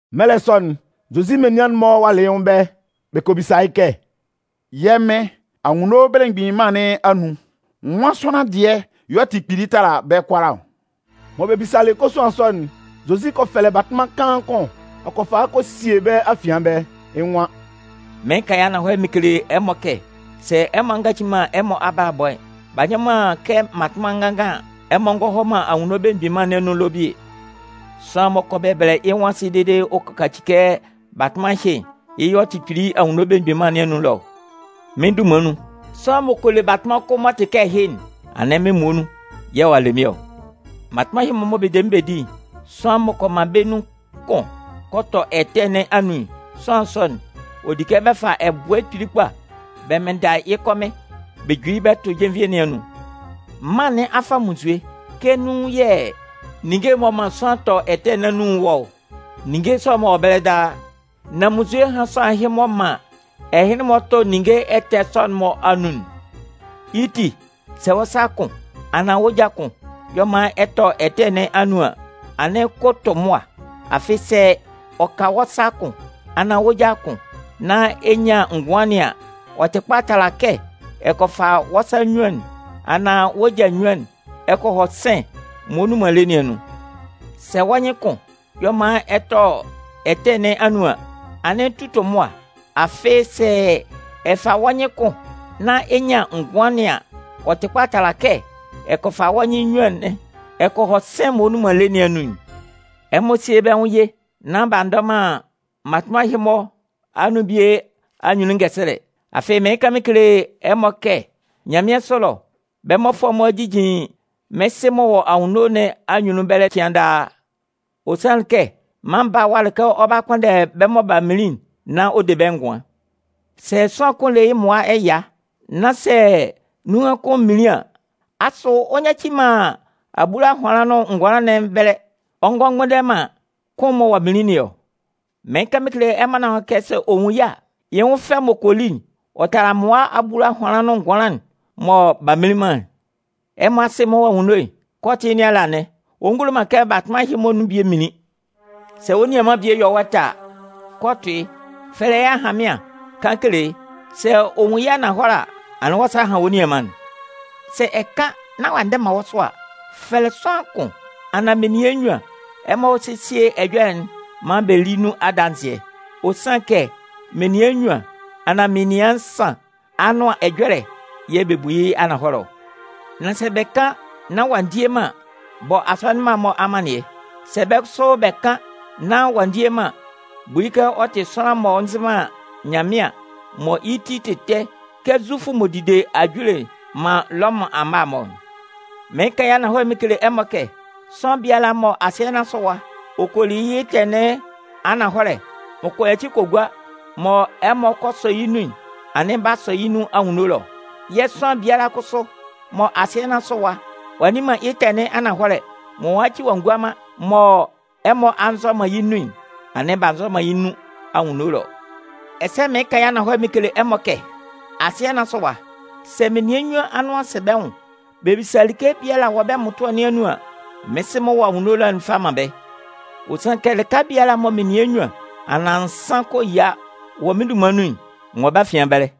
Mɛlɛ sɔ'n, Zozi menian'n-mɔ walɩ yɩ́ nwʋn ɛbɛlɛ, bɛ kɔ bisa yɩ́ kɛ: “Yɛ́ Mɩn, Anwunno Belemgbin Mân nɩn anun, nwan sʋanlan dɩɛ y'ɔ tɩ kpili tala bɛ́ kʋalaa ɔ?” Mɔ bɛ bisalɩ kosuan sɔ'n, Zozi kɔ fɛlɛ batʋnman kaan kʋn, ɔ kɔ fa yɩ́ kɔ sie bɛ́ afian ɛbɛlɛ. Yɛ̂ yɩ́ nwan: “Mɩɩn kan yɩ́ ananhɔlɛ mɩn kele ɛmɔ kɛ sɛ ɛmɔ a ngaci man ɛmɔ abalabɔ'n, b'a nyɔ man kɛ mmatʋnman nganngan an, ɛmɔ ngɔ man Anwunno Belemgbin Mân nɩn anun ɛlɔ bie. Sʋanlan m'ɔ kɔ bɛbɛlɛ yɩ́ nwʋn asɩ dede ɔ kɔ kaci kɛ batʋnman ɛhɩ'n, yɩ́ y'ɔ tɩ kpili Anwunno Belemgbin Mân nɩn anun ɛlɔ ɔ. Mɩ́n dunman nun, sʋanlan m'ɔ kɔ le batʋnman kʋn m'ɔ tɩ kɛ ɛhɩ'n, anɩn mɩ́n muonun yɛ̂ ɔ'a le mɩ́n ɔ. “Mmatʋnman ɛhɩ-mɔ mɔ bɛ de mɩ́n bɛ di'n, sʋanlan m'ɔ kɔ man bɛ́ nun kʋn kɔ tɔ ɛtɛ nɩn anun'n, sʋanlan sɔ'n, ɔ di kɛ bɛ fa ɛbʋɛ kpili kpa bɛ mɩnnda yɩ́ kɔmɩn bɛ ju yɩ́ bɛ tʋ jenvie nɩn anun. Mân nɩn a fa munnzue kɛ nun yɛ̂ ninnge m'ɔ man sʋanlan tɔ ɛtɛ nɩn anun'n wɔ ɔ. Ninnge sɔ'n-mɔ wɔ ɛbɛlɛ daa. Nan munnzue hán sʋanlan ɛhɩ m'ɔ man ɛhɩnlɩn-mɔ tɔ ninnge ɛtɛ sɔ'n-mɔ anun'n. Yɩ́ ti, sɛ wɔ́ sa kʋn anaan wɔ́ ja kʋn y'ɔ man ɛ tɔ ɛtɛ nɩn anun an, anɩn ko tʋ mʋa. Afɩ sɛ ɔ ka wɔ́ sa kʋn anaan wɔ́ ja kʋn nán ɛ nyan ngʋan nɩn an, ɔ tɩ kpa tala kɛ ɛ kɔ fa wɔ́ sa nnyuan'n, anaan wɔ́ ja nnyuan nɩn ɛ kɔ hɔ sɩ̂n'n m'ɔ nnun man lé nɩn anun'n. Sɛ wɔ́ nyɩn kʋn y'ɔ man ɛ tɔ ɛtɛ nɩn anun an, anɩn tu tʋ mʋa. Afɩ sɛ ɔ ka wɔ́ nyɩn kʋn nán ɛ nyan ngʋan nɩn an, ɔ tɩ kpa tala kɛ ɛ kɔ fa wɔ́ nyɩn nnyuan nɩn ɛ kɔ hɔ sɩ̂n'n m'ɔ nnun man lé nɩn anun'n. “Ɛmɔ síe bɛ́ nwʋn ye nán b'a ndʋtʋ man mmatʋnman ɛhɩ-mɔ anun bie anyunnun ngɛsɛlɛ. Afɩ mɩɩn kan mɩn kele ɛmɔ kɛ nyanmɩansʋ ɛlɔ, bɛ́ mmɔfʋɛ'n-mɔ jijin mɩ́n Sɩ m'ɔ wɔ anwunno nɩn anyunnun ɛbɛlɛ cɩan daa. [ Ɔ sanlɩn kɛ, Mân Baa'n walɩ kɛ ɔ 'ba kpʋnndɛ bɛ́ mɔ b'a minlin'n nán ɔ de bɛ́ ngʋan.] Sɛ sʋanlan kʋn le yɩ́ mmʋa ɛya, nán sɛ nunhan kʋn minlin an, asʋ ɔ nyaci man abulahʋanlan nʋn ngʋanlan nɩn ɛbɛlɛ, ɔ ngɔ mgbʋnndɛ man kʋn'n mɔ ɔ'a minlin nɩn ɔ? Mɩɩn kan mɩn kele ɛmɔ kɛ sɛ ɔ nwun yɩ́ a, yɩ́ nwʋn fɛ'n m'ɔ kɔ li'n, ɔ tala mmʋa abulahʋanlan nʋn ngʋanlan'n mɔ b'a mminlin man'n. Ɛmɔ Asɩ'n m'ɔ wɔ anwunno'n, kɛ ɔ tɩ yɩ́ nɩn ala anɩn. Ɔ ngulo man kɛ mmatʋnman ɛhɩ-mɔ bie minlin. “Sɛ wɔ́ nianman bie yɔ wɔ́ ɛtɛ a, kɔ tʋ yɩ́, fɛlɛ yɩ́ ahanmɩan kan kele yɩ́. Sɛ ɔ nwun yɩ́ ananhɔlɛ a, anɩn wɔ́ sa a han wɔ́ nianman'n. Sɛ ɛ kan nán ɔ'a ndɛ man wɔ́ sʋ a, fɛlɛ sʋanlan kʋn anaan menian nnyuan ɛmɔ hɔ́ sésie ɛjɔlɛ'n maan bɛ lí nun adanzɩɛ. Ɔ sanlɩn kɛ menian nnyuan anaan menian nsan anʋan ɛjɔlɛ'n yɛ̂ bɛ bu yɩ́ ananhɔlɛ ɔ. Nan sɛ bɛ kan nán ɔ'a ndie man an, bɔ asɔnɩn mma'n-mɔ amannɩɛ. Sɛ bɛ́ kʋsʋ bɛ kan nán ɔ'a ndie man an, bu yɩ́ kɛ ɔ tɩ sʋanlan m'ɔ nzɩ man Nyanmɩan mɔ yɩ́ ti tɩ ɛtɛ kɛ Zufʋ m'ɔ dide ajule man Lɔmʋn amma'n-mɔ'n. “Mɩɩn kan yɩ́ ananhɔlɛ mɩn kele ɛmɔ kɛ, sʋanlan biala mɔ asɩɛ nɩn asʋ ɛwa ɔ kɔ li yɩ́ ɛtɛ nɩn ananhɔlɛ, m'ɔ kɔ yaci kɔ gua, mɔ ɛmɔ kɔ sɔ yɩ́ nun'n, anɩn b'a sɔ yɩ́ nun anwunno ɛlɔ. Yɛ̂ sʋanlan biala kʋsʋ mɔ asɩɛ nɩn asʋ ɛwa ɔ'a nni man yɩ́ ɛtɛ nɩn ananhɔlɛ, mɔ ɔ'a nyaci ɔ'a ngua man, mɔ ɛmɔ a nzɔ man yɩ́ nun'n, anɩn b'a nzɔ man yɩ́ nun anwunno ɛlɔ. “Ɛsɛ mɩɩn kan yɩ́ ananhɔlɛ mɩn kele ɛmɔ kɛ, asɩɛ nɩn asʋ ɛwa, sɛ menian nnyuan anʋan sɛ bɛ́ nwʋn bɛ bisa like biala wɔ bɛ́ mmʋtʋɛ nɩn anun an, mɩ́n Sɩ m'ɔ wɔ anwunno ɛlɔ'n 'fa man bɛ́. Ɔ sanlɩn kɛ lɩka biala mɔ menian nnyuan anaan nsan kɔ yia wɔ mɩ́n dunman nun'n, n wɔ bɛ́ afian ɛbɛlɛ.”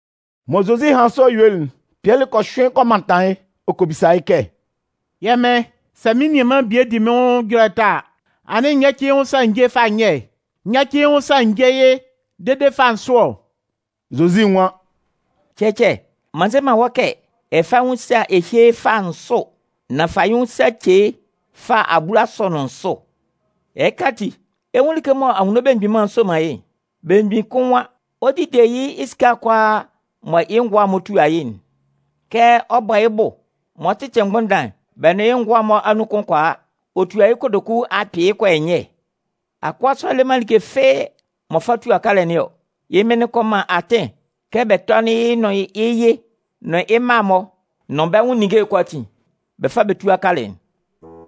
Mɔ Zozi hanlɩn sɔ yuelɩ'n, Pɩɛlɩ kɔ hyʋɩn kɔ mantan yɩ́ ɔ kɔ bisa yɩ́ kɛ: “Yɛ́ Mɩn, sɛ mɩ́n nianman bie di mɩ́n nwʋn ɛjɔlɛ ɛtɛ a, anɩn n yáci yɩ́ nwʋn sa n jé yɩ́ fâ nyɛ? N yáci yɩ́ nwʋn sa n jé yɩ́ dede fâ nsʋ ɔ?” Zozi nwan: “Cɛcɛ, m'an nze man wɔ́ kɛ ɛ fá yɩ́ nwʋn sa ɛ hyé yɩ́ fâ nsʋ, nan fa yɩ́ nwʋn sa ce yɩ́ fâ abulasʋ nʋn nsʋ. “Ɛhɩ ati, ɛ 'nwun like mɔ Anwunno Belemgbin Mân'n soman yɩ́'n. Belemgbin kʋn nwan ɔ 'dide yɩ́ esika'n kʋalaa mɔ yɩ́ ngʋa'n-mɔ tua yɩ́'n. Kɛ ɔ bɔlɩ yɩ́ bʋ mɔ ɔ 'tɩtɩ mgbʋndan'n, bɛ nʋn yɩ́ ngʋa'n-mɔ anun kʋn kɔ a, ɔ tua yɩ́ kotoku akpɩɩ kɔ yɔ nyɛ. Akʋa sɔ'n le man like fɩ́ɩ́ m'ɔ fa tua kalɛ nɩn ɔ. Yɩ́ mɩn'n kɔ man atɩn kɛ bɛ tɔ́nɩn yɩ́ nʋn yɩ́ yɩ, nʋn yɩ́ mma'n-mɔ nʋn bɛ́ nwʋn ninnge'n kʋalaatin bɛ fá bɛ túa kalɛ'n.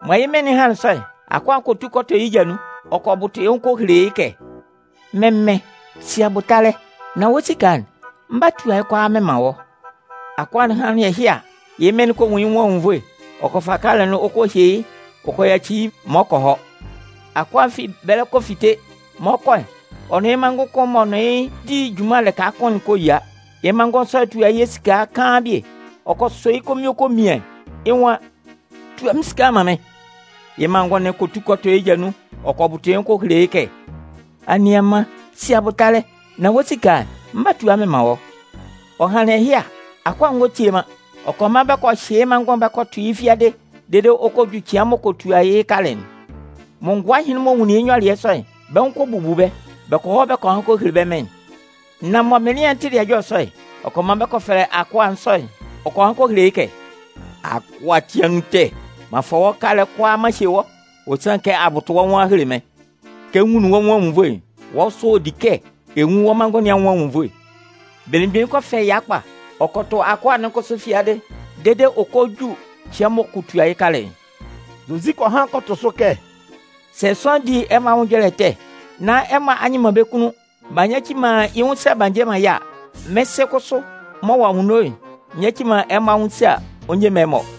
“Mɔ yɩ́ mɩn'n hanlɩn sɔ'n, akʋa'n kɔ tu kɔ tɔ yɩ́ ja nun ɔ kɔ bʋtʋ yɩ́ nwʋn ɔ kɔ hele yɩ́ kɛ: ‘Mɩ́n mɩn, si abʋtalɛ, nán wɔ́ esika'n, m 'ba tua yɩ́ kʋalaa mɩn man wɔ́.’ Akʋa'n hanlɩn ɛhɩ a, yɩ́ mɩn'n kɔ nwun yɩ́ nwʋn anwunnvoe, ɔ kɔ fa kalɛ'n ɔ kɔ hye yɩ́ ɔ kɔ yaci yɩ́ maan ɔ kɔ hɔ. “Akʋa'n fi ɛbɛlɛ ɔ kɔ fite. Mɔ ɔ 'kɔ'n, ɔ nʋn yɩ́ manngʋn kʋn m'ɔ nʋn yɩ́ di junman lɩka kʋn'n kɔ yia. Yɩ́ manngʋn sɔ'n tua yɩ́ esika kaan bie. Ɔ kɔ sɔ yɩ́ konvin ɔ kɔ mian. Yɩ́ nwan: ‘Tua mɩ́n esika'n man mɩ́n!’ “Yɩ́ manngʋn'n kɔ tu kɔ tɔ yɩ́ ja nun ɔ kɔ bʋtʋ yɩ́ nwʋn ɔ kɔ hele yɩ́ kɛ: ‘Anianman, si abʋtalɛ, nán wɔ́ esika'n, mɩn 'ba tua mɩn man wɔ́.’ “Ɔ hanlɩn ɛhɩ a, akʋa'n ngɔ tie man, ɔ kɔ man bɛ kɔ hyɩ yɩ́ manngʋn'n bɛ kɔ tʋ yɩ́ fiadɩ dede ɔ kɔ ju cɩan mɔ ɔ kɔ tua yɩ́ kalɛ'n. Mɔ ngʋa ɛhɩnlɩn-mɔ nwunlin yɩ́ nyɔlɩɛ sɔ'n, bɛ́ nwʋn kɔ bubu bɛ́, bɛ kɔ hɔ kɔ han kɔ hele bɛ́ mɩn'n. “Nan mɔ mɩnlɩan'n tɩlɩ ɛjɔlɛ sɔ'n, ɔ kɔ man bɛ kɔ fɛlɛ akʋa sɔ'n, ɔ kɔ han kɔ hele yɩ́ kɛ: ‘Akʋa ati anun ɛtɛ! M'an fa wɔ́ kalɛ'n kʋalaa m'an hye wɔ́. Ɔ sanlɩn kɛ a bʋtʋ wɔ́ nwʋn a hele mɩ́n. Kɛ n nwunlin wɔ́ nwʋn anwunnvoe'n, wɔ́ kʋsʋ ɔ di kɛ ɛ nwun wɔ́ manngʋn nɩn anwʋn anwunnvoe.’ Belemgbin'n kɔ fɛ ɛya kpa, ɔ kɔ tʋ akʋa'n kʋsʋ fiadɩ dede ɔ kɔ ju cɩan m'ɔ kɔ tua yɩ́ kalɛ'n.” Zozi kɔ han kɔ tʋ sʋ kɛ: “Sɛ sʋanlan di ɛmɔ anwʋn ɛjɔlɛ ɛtɛ nán ɛmɔ a nyɩ man bɛ́ kunnun b'a nyaci man yɩ́ nwʋn sa b'a nje man yɩ́ a, mɩ́n Sɩ'n kʋsʋ m'ɔ wɔ anwunno'n nyaci man ɛmɔ anwʋn sa ɔ nje man ɛmɔ.”